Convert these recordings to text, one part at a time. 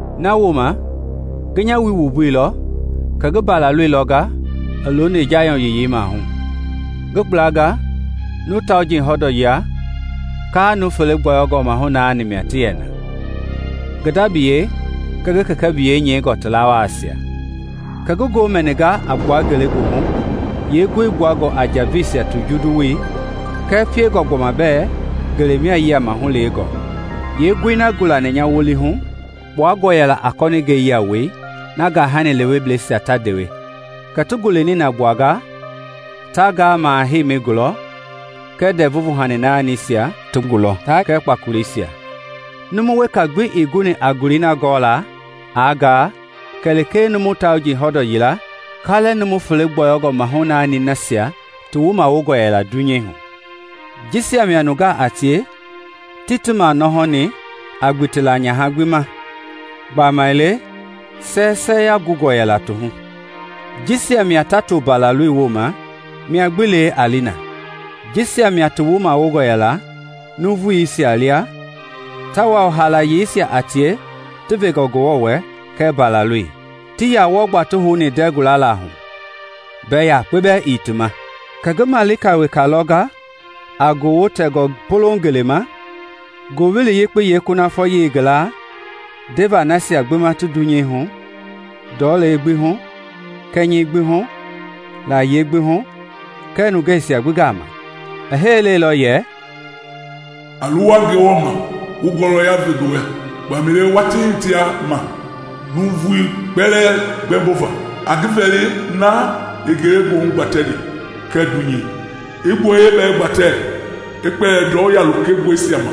Nawooma ngi nya wui wumbuilɔ kɛ ngi Mbalaloi lɔnga looni Jayɔn Yiyei maahu; ngi gblanga nuu tauji hɔndɔ yila, kalɛ nuu fele gbɔyɔngɔ mahu naani mia ti yɛ na, ngi da biyei kɛɛ ngi kɛkɛ biyei nyɛingɔ ti lawaisia. Kɛ ngi ngoo mɛninga a gbua ngelegoohu yeengoi gbuangɔ a njaveisia ti jundu woi kɛɛ piengɔ gbɔma bɛ ngelei mia yiama hulewengɔ. Yeengoi na gulani nya wolihu kpuangɔ yɛla a kɔninge lewewoi na gahani lewebleisia ta ndewe. Kɛ ti gule nina gbuanga ti ngaa maha heimi gulɔ kɛɛ ndɛvu vuhani naanisia ti gulɔ taa kpakoleisia. Numu weka gbii guni a gulei na gɔɔla aa ngaa kɛlee nuu tauji hɔndɔ yilei, kalɛ nuu fele gbɔyɔngɔ mahu naanisia ti wumawongɔ yɛla dunyei hu. Jisia mia nungaa a tie tii ti manɔhɔni a gbitila nyaha gbi ma, gbamaile sɛsɛya gungɔ yɛla ti hu. Jisia mia ta to Mbalaloi woma mia gbi lee a li na. Jisia mia ti wumawongɔ yɛla nuuvuisia lia tawao haalayeisia a tie ti vengɔ Ngewɔ wɛ kɛɛ Mbalaloi. Tii yaa wɔɔ gbaa ti houni ndɛɛ gulala hu; mbɛ yakpe bɛɛ ii ti ma. Kɛ ngi malika weka lɔnga a gowo tɛngɔ polouŋ ngeleima Ngowili Yekpei yeekunafɔyei ngi laa ndeva nasia gbi ma ti dunyei hu, ndɔlei gbi hu, kɛnyɛi gbi hu, layie gbi hu kɛɛ nungeisia gbi gama. I hee lailɔ yɛ, “A luwa Ngewɔ ma wu ngɔlɔya ve ngi wɛ, gbamaile watii hitea ma nuuvui kpɛlɛɛ gbɛmbova. A ngi vɛli na i ngelegoohu gbatɛni kɛɛ dunyei, i gboyei bɛɛ gbatɛ i kpɛli ndɔu ya lokengɔsia ma!”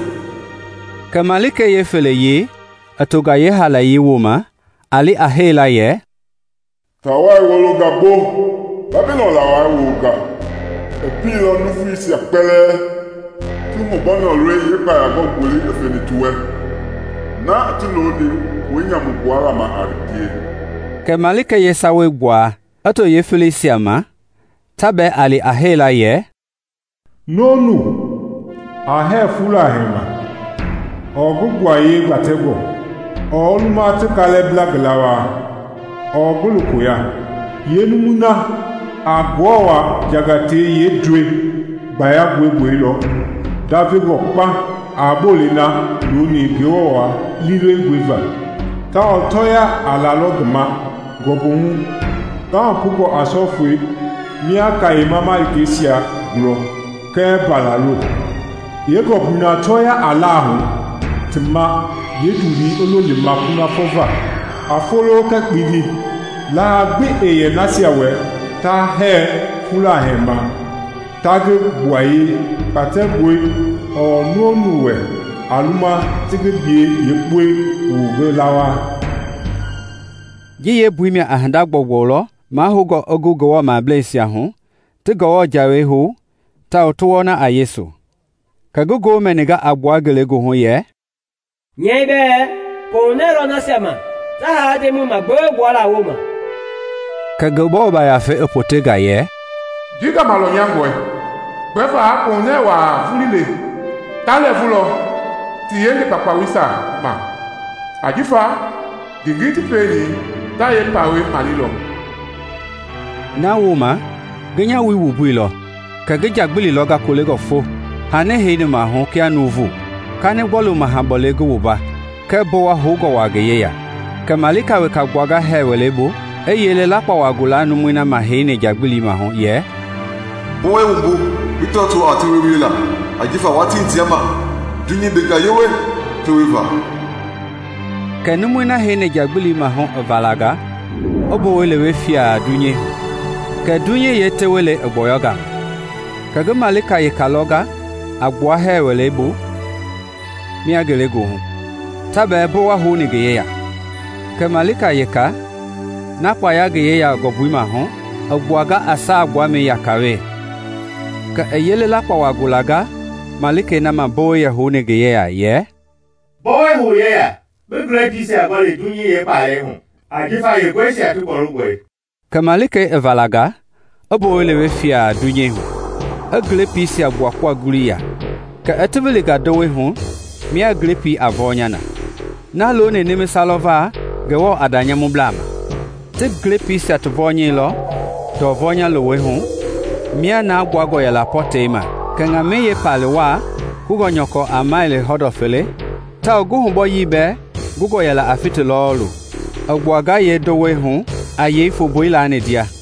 Kɛ malikei yeefeleyei i tonga yeehaalayei woma a li a hee la yɛ, “Taawai wolonga gbo, Babilɔn lawai wolonga! I pielɔ nuuvuisia kpɛlɛɛ ti hubɔnɔ lɔi yeekpayangɔ gboli i feni ti wɛ, na i ti looni pue nyamu gbuala ma a ngie.” Kɛ malikei yeesawei gbuaa i to yeefeleisia ma ta bɛɛ a li a hee la yɛ, “Nu-o-nu a hɛɛ fula huɛi ma ɔɔ ngi gbuayei gbatɛngɔi, ɔɔ a luma ti kalɛ bla ngi lawaa ɔɔ ngi lokoi ya, yeenumui na a Ngewɔ jangatɛi yeendɔɔ gbayangɔi gbolilɔ ndavengɔ kpauŋ a bolei na looni Ngewɔ liilewengɔi va. Tawao tɔɔya a lalɔ ngi ma ngɔmbu hu ngahupungɔ a sɔifɛi mia kayema malikeisia gulɔ kɛɛ Mbalaloi. Yeengɔmbui na tɔɔya a la hu ti ma yeendulii a lo lɛmaa kunafɔ va. A folo kɛɛ kpindi laha gbi ɛɛ yɛ nasia wɛ ta hɛɛ fula huɛi ma taa ngi gbuayei gbatɛngɔi, ɔɔ nu-o-nu wɛ a luma ti ngi biyei yeekpɔi wu ngi lawaa.” Ji yeembui mia a hinda gbɔugbɔu lɔ mahoungɔ i gu Ngewɔ mableisia hu, ti Ngewɔ jawei hou tawao ti wɔna a Yesu. Kɛ ngi ngoo mɛninga a gbua ngelegoohu yɛ, “Nyɛi bɛ: Koohunɛɛ lɔ nasia ma ta haa Ndemɔi magbewe gbuala woma!” Kɛ Ngewɔ Yafei i potenga yɛ, “Ji gama lɔnyangɔi, gbɛva kohunɛ wa vuii le. Ta lɛɛvulɔ ti yenge kpaukpausia ma, ajifa ngengei ti pieni ta yeepawei malelɔ.” Nawooma ngi nya wui wumbuilɔ, kɛ ngi nja gbili lɔnga kolengɔ fo, hani heini maahu kia nuuvu, kanigbɔlu maha bɔlei ngi wumba kɛɛ mbowa houngɔ wa ngi yeya. Kɛ malika wekei gbuanga hɛɛ wɛleibu kɛ i yele lakpawa gulanga numui na ma yɛ heini nja gbili maahu yɛ, “Mbowɛi wumbu bi tɔɔto a tewe wiela, ajifa watii hitea ma; dunyei benga yewe tewe va!” Kɛ numui na heini nja gbili maahu i valanga i mbowɛi lewe fiaŋ dunyei hu, kɛ dunyei yeetewelei i gbɔyɔnga ma. Kɛ ngi malika wekei lɔnga a gbua hɛɛ wɛleibu mia ngelegoohu, ta bɛɛ mbowɛi houni ngi yeya. Kɛ malika wekei, na kpaya ngi yeya ngɔmbui maahu, i gbuanga a saa gbuamɛi yaka we. Kɛ i yele lakpawa gulanga malikei na ma mbowɛi yɛ houni ngi yeya yɛ, “Mbowɛi hou yeya bi glepiisia ngɔli dunyei yeekpalɛi hu ajifa yeenguɛisia ti gbɔlungɔi!” Kɛ malikei i valanga i mbowɛi lewe fiaŋ dunyei hu, i glepiisia gbuakpua ngului ya, kɛ i ti wilinga ndowei hu mia glepii a vɔnya na, na looni nimisa lɔ va Ngewɔ a da nyamublaa ma. Ti glepiisia ti vɔnyɛilɔ ndɔ vɔnya lowei hu mia na gbuangɔ yɛla pɔ tɛi ma, kɛ ŋamɛi yeepali wa, kungɔ a mɛli hɔndɔ fele tawao ngi hubɔyii bɛɛ kungɔ a fiti lɔɔlu, i gbuanga yeendowei hu a yei fombui laani ndia.